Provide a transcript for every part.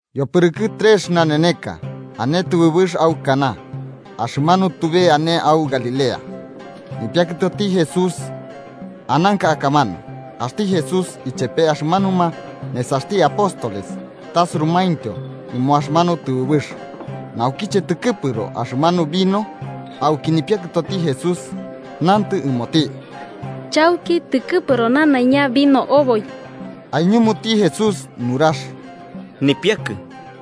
Yopɨrɨkɨ trex naneneka ane tɨbɨbɨx au Caná, axɨmanu tube ane au Galilea. Nipiakɨtoti Jesús ananka akamanu, axti Jesús ichepe axɨmanuma nesaxti apóstoles tasurumaintyo ɨmo axɨmanu tɨbɨbɨx. Naukiche tɨkɨpɨro axɨmanu vino, auki nipiakɨtoti Jesús nantɨ ɨmoti: –Chauki tɨkɨpɨro nanaiña vino oboi. Aiñumuti Jesús nurax: –Nipiakɨ,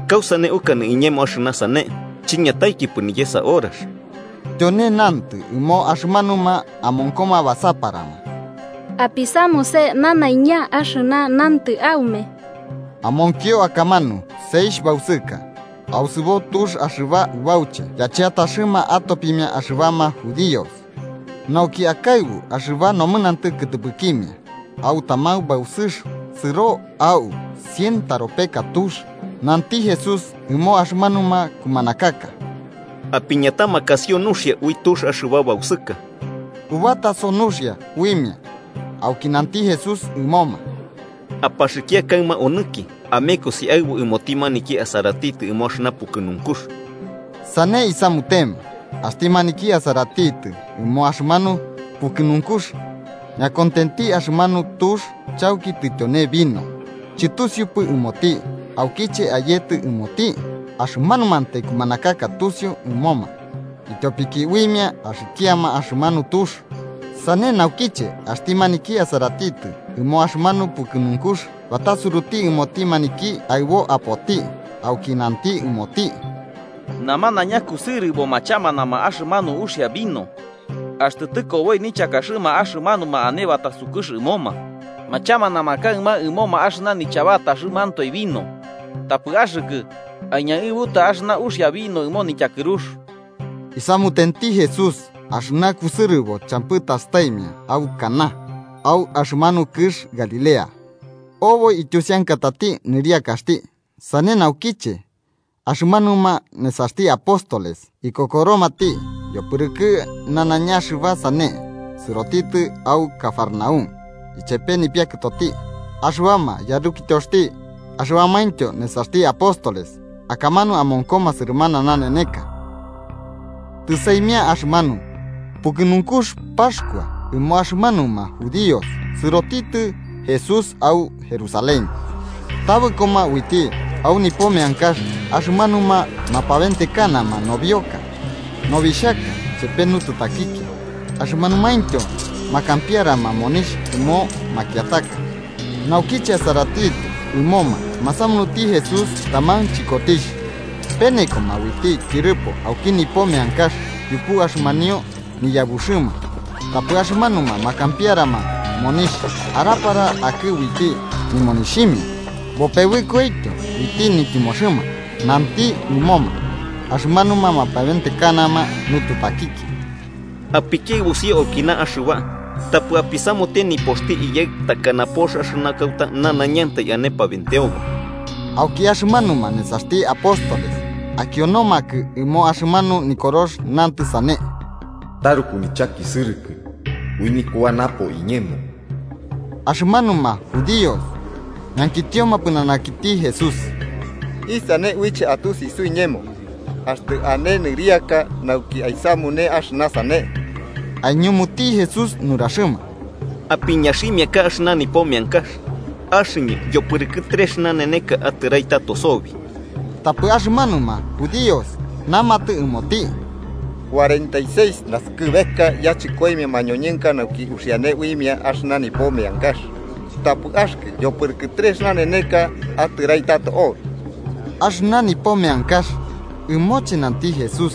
¿kausane ukanɨ iñemo axɨna sane? Chiñataikipɨ niyesa horax. Tyone nantɨ ɨmo axɨmanuma amonkoma basaparama: –Apisamuse nanaiña axɨna nantɨ aume. Amonkio akamanu seixh bausɨka, ausɨbo tux axɨba ubauche yacheataxɨma atopimia axɨbama judíos nauki akaɨbu axɨba nomɨnantɨ kɨtɨpɨkimia. Au taman bausɨx sɨro a'u cien taropeka tux. Nanti Jesús ɨmo axɨmanuma kumanakaka: –Apiñatamakasio nuxia ui tux axɨba bausɨka. Ubataso nuxia uimia. Auki nanti Jesús ɨmoma: –Apaxɨkia kaɨma onɨki amekosi aɨbu ɨmoti maniki asaratitɨ ɨmo axɨna pukɨnunkux. Sane isamutema. Axti maniki asaratitɨ ɨmo axɨmanu pukɨnunkux ñakontenti axɨmanu tux chauki tityone vino, chɨtusiupɨ ɨmoti aukiche ayetɨ ɨmoti. Axɨmanumantai kumanakaka tusiu ɨmoma, ityopiki uimia axikiama axɨmanu tux. Sane naukiche axti maniki asaratitɨ ɨmo axɨmanu pukɨnunkux batasuruti ɨmoti maniki aɨbo apoti auki nanti ɨmoti: –Namanaiña kusɨrɨbo machamanama axɨna uxia vino, axtɨ tɨkoboi nichakaxɨma axɨmanuma ane batasukux ɨmoma, machamanama kaɨma ɨmoma axɨna nichabataxɨmantoe vino. Tapɨ axɨkɨ aiñaɨbuta axɨna uxia vino ɨmo nityakɨrux. Isamutenti Jesús axɨna kusɨrɨbo champɨ tastaimia au Caná, au axɨmanu kɨx Galilea. Oboi ityusiankatati nɨriakaxti. Sane naukiche axɨmanuma nesaxti apóstoles ikokoromati. Yopɨrɨkɨ nanaiña axɨba sane sɨrotitɨ au Cafarnaúm, ichepe nipiakɨtoti, axɨbama yarukityoxti axɨbamaintyo nesaxti apóstoles. Akamanu amonkoma sɨrɨmana naneneka. Tɨsaimia axɨmanu pukɨnunkux Paxkua ɨmo axɨmanuma judíos sɨrotitɨ Jesús au Jerusalén. Tabɨkoma uiti au nipo meankax axɨmanuma mapabentekanama nobioka, nobixhaka chepe nututakikia, axɨmanumaintyo makampiarama monixh ɨmo makiataka. Naukiche asaratitɨ ɨmoma, masamunuti Jesús taman chɨkotixh penekoma uiti tyɨrɨpo auki nipo meankax yupu axɨmanio niyabuxɨma. Tapɨ axɨmanuma makampiarama monixh arapara akɨ uiti nimonixhimia bopebɨkoityo uiti nityɨmoxɨma. Nanti ɨmoma axɨmanuma mapabentekanama nututakikia: –¡Apikiaɨbusio aukina axɨba! ¡Tapɨ apisamute nipoxti Iyaɨ takana pox axɨna kauta nanaiñantai ane pabenteobo! Auki axɨmanuma nesaxti apóstoles akionomakɨ ɨmo axɨmanu Nikorox nantɨ sane: “Taruku nichakisɨrɨkɨ ui nikuax napo iñemo.” Axɨmanuma judíos ñankitioma pɨnanakiti Jesús: –¿Isane uiche atusi suiñemo axtɨ ane nɨriaka nauki aisamune axɨna sane? Aiñumuti Jesús nuraxɨma: –Apiñaximiaka axɨna nipo meankax, axɨñɨ yopɨrɨkɨ trex naneneka atɨrai tato sobi. Tapɨ axɨmanuma judíos namatɨ ɨmoti: –Cuarenta seis naskɨbeka yachɨkoimia mañoñɨnka nauki uxiane uimia axɨna nipo meankax, ¿tapɨ axɨkɨ yopɨrɨkɨ trex naneneka atɨrai tato obi? Axɨna nipo meankax ɨmoche nanti Jesús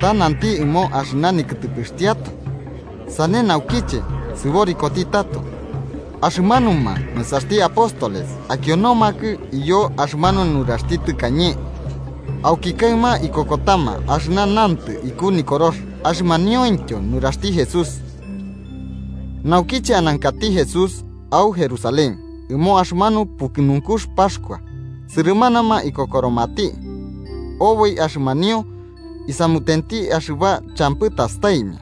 ta nanti ɨmo axɨna nikɨtɨpɨxtiatoe. Sane naukiche, sɨborikoti tato, axɨmanuma nesaxti apóstoles akionomakɨ iyo axɨmanu nuraxti tɨkañe, auki kaɨma ikokotama axɨna nantɨ iku Nikorox axɨmaniointyo nuraxti Jesús. Naukiche anankati Jesús au Jerusalén, ɨmo axɨmanu pukɨnunkux Paxkua, sɨrɨmanama ikokoromati oboi axɨmanio isamutenti axɨba champɨ tastaimia.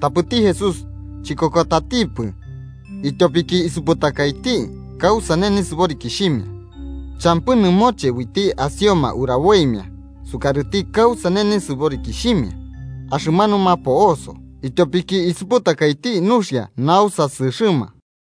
Tapɨti Jesús chikokotatipɨ, ityopiki isuputakaiti kausane nisɨborikixhimia. Champɨ nɨmoche uiti asioma uraboimia sukarɨti kausane nisɨborikixhimia axɨmanuma po'oso, ityopiki isuputakaiti nuxia nausasɨxɨma.